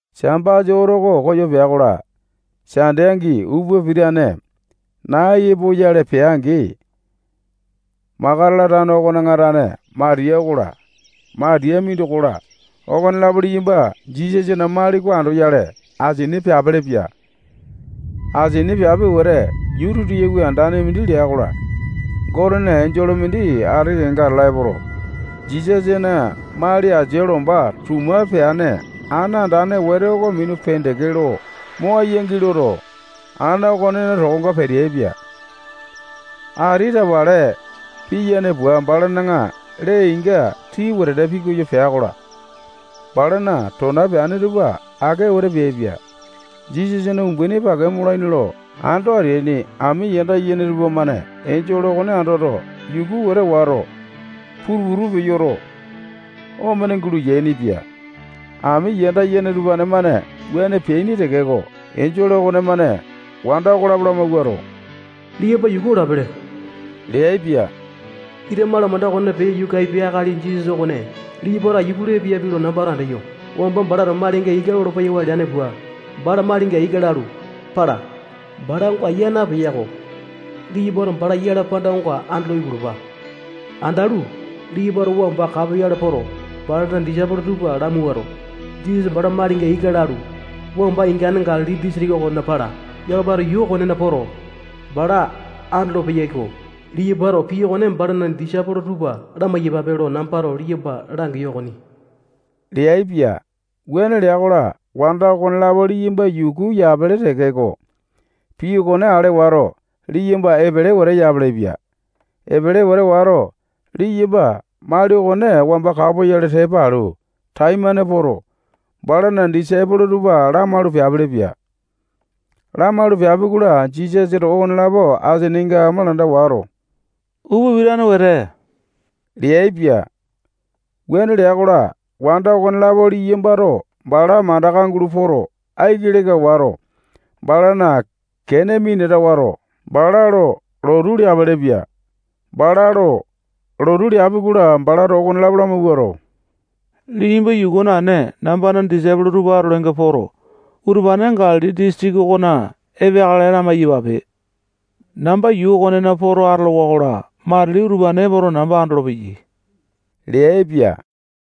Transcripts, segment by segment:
Sambasa oto oko koyo pea-kola, Sande angi upa pitane nai epoyale peai-angi, Makatala tano okona tane Matiya okola, Matiya mindoko-la, okonelapo liyamba Jisasana mali oko andoyale asini peapelepia. Asini peapi wete, yuu titiyawi andane mindi lea-kola, Gotena enjole mindi ati kenga atala epoto, Jisasana mali asia lomba tuma peane ana andane wete oko minu pendeke lo mo aiyangi loto, ana okonena tokonga peteaipia. Ati tapale piyane pua, balana lee-inga tii wetete pikoyo pea-kola, balana tona peane tupa ake wete peaipia. Jisasana umbaini pake molaini ando ateaini ami yanda yene tupamane enjole okone andoto, yuku wete wato, putu-putu peyoto, omene gulo yainipia. Ami yanda yene utupane-mane wuane peaini tekeko, enjole okonemane wanda okolapo lamawuato, liyamba yuku olapele leaipia. Ita malamanda okona peyo yuka apiai akali Jisasa okone liyambato aiya pulu epeyapi lo nambato andeyo. Wamba balato malinga ika lolo-peyawa leane pua, bala malinga ika lalu, pala. Bala onga yaa napeya-ko. Liyambato bala yala panda oko andolo ipulupa. Andalu, liyambato wamba kapoyale poto, balana disaipolo tupa lamawuato, Jisasa bala malinga ika lalu, wamba ingane Galili disitiki okona pala. Yakamato yuu okonena poto, bala andolo-peyaiko. Liyambato pii okone balana disaipolo tupa lamai-yapape lo nambato liyamba langeyo okoni leaipia. Wuane lea-kola, wanda okonelapo liyamba yuku yapele tekeko, pii okone ale wato, liyamba epele wete yapelepia. Epele wete wato, liyamba mali okone wamba kapoyale tepa alu taimane poto, balana disaipolo tupa lamaulu peapelepia. Lamaulu peapi-kola, Jisasato okonelapo asininga malamanda wato, upa pitane wete leaipia. Wuane lea-kola, wanda okonelapo liyambato bala mandaka gulo poto, aiki leka wato, balana kene minata wato, bala lo lotu leapelepia. Bala lo lotu leapi-kola, balato okonelapo lamawuato, liyamba yuku naene, nambana disaipolo tupa atolainga poto, utupane Galili disitiki okona epeakale lamai-yapape. Namba yuu okonena poto atolowa-kola, matili utupane epoto, namba andolopeyai leaipia.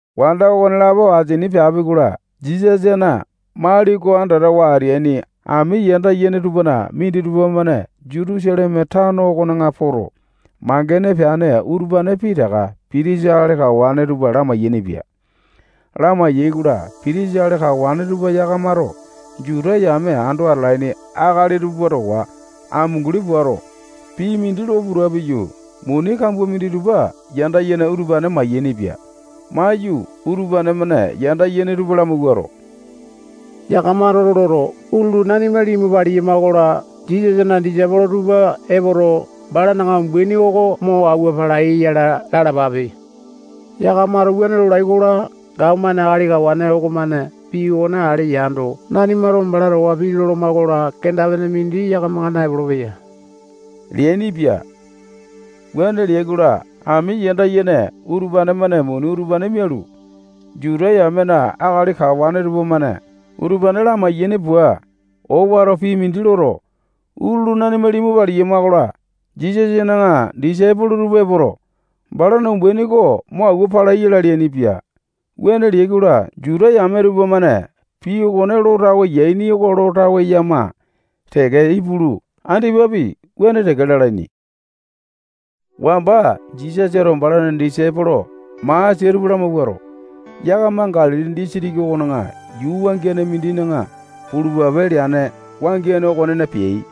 Wanda okonelapo asini peapi-kola, Jisasana mali oko andatawa ateaini ami yanda yene tupana minditupa-mane Jutusaleme tano okona poto, mangene peane utupane pitaka pitisa akali kawane tupa lamai-yainipia. Lamai-yaikola, pitisa akali kawane tupa yakamato Juta yame ando atalaini akali tupa towa amunguli puato, pii mindi lo puta piyu, muni kambua minditupa yanda yene utupane mayainipia. Maiyu, utupane-mane yanda yene tupa lamawuato, yakamato loto, utulu nanima limu paliyama-kola, Jisasana disaipolo tupa epoto, balana umbaini oko mo awua palai yala lalapape. Yakamato wuane lolai-kola, gapomane akali kawane okomane pii okone ale yando, nanimato bala towa pii loloma-kola, kenda-pene mindi yakamanga naepolo-peya leainipia. Wuane leai-kola, ami yanda yene utupane-mane muni utupane mialu, Juta yamena akali kawane tupamane utupane lamai-yaini pua, owato pii mindi loto, utulu nanima limu paliyama-kola, Jisasana disaipolo tupa epoto, balana umbaini oko mo awua palai yala leainipia. Wuane leai-kola, Juta yame tupamane pii okone lo tawe yaini oko lo tawe yama teke ipulu, andipapi wuane teke lalaini. Wamba Jisasato balana disaipolo masia tupa lamawuato, yakama Galili disitiki okona yuu wangiane mindina pulupape leane wangiane okonena peai.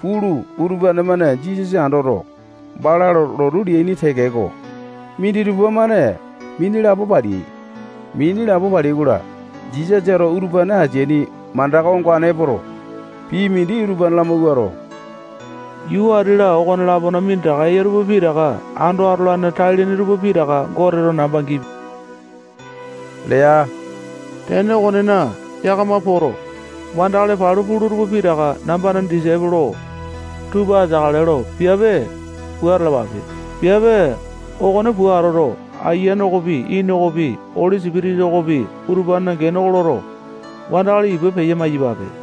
Pulu, utupane-mane Jisasa andoto, bala lo lotu leaini tekeko, minditupa-mane mini lapo paleai. Mini lapo paleai-kola, Jisasato utupane ateaini mandaka ongane epoto, pii mindi utupane lamawuato, yuu ati-la, okolapona minditaka eya tupa pitaka ando atolane tai-lene tupa pitaka Goteto namba gipia lea. Tene okonena, yakama poto, wandakali palu pula tupa pitaka nambana disaipolo tupa ateakale lo piape pua atalapape. Piape okone pua atoto, Aiyane okopi, Ini okopi, Oli Sipitisa okopi, utupanena gene oko loto, wandakali ipa peya-maiyapape.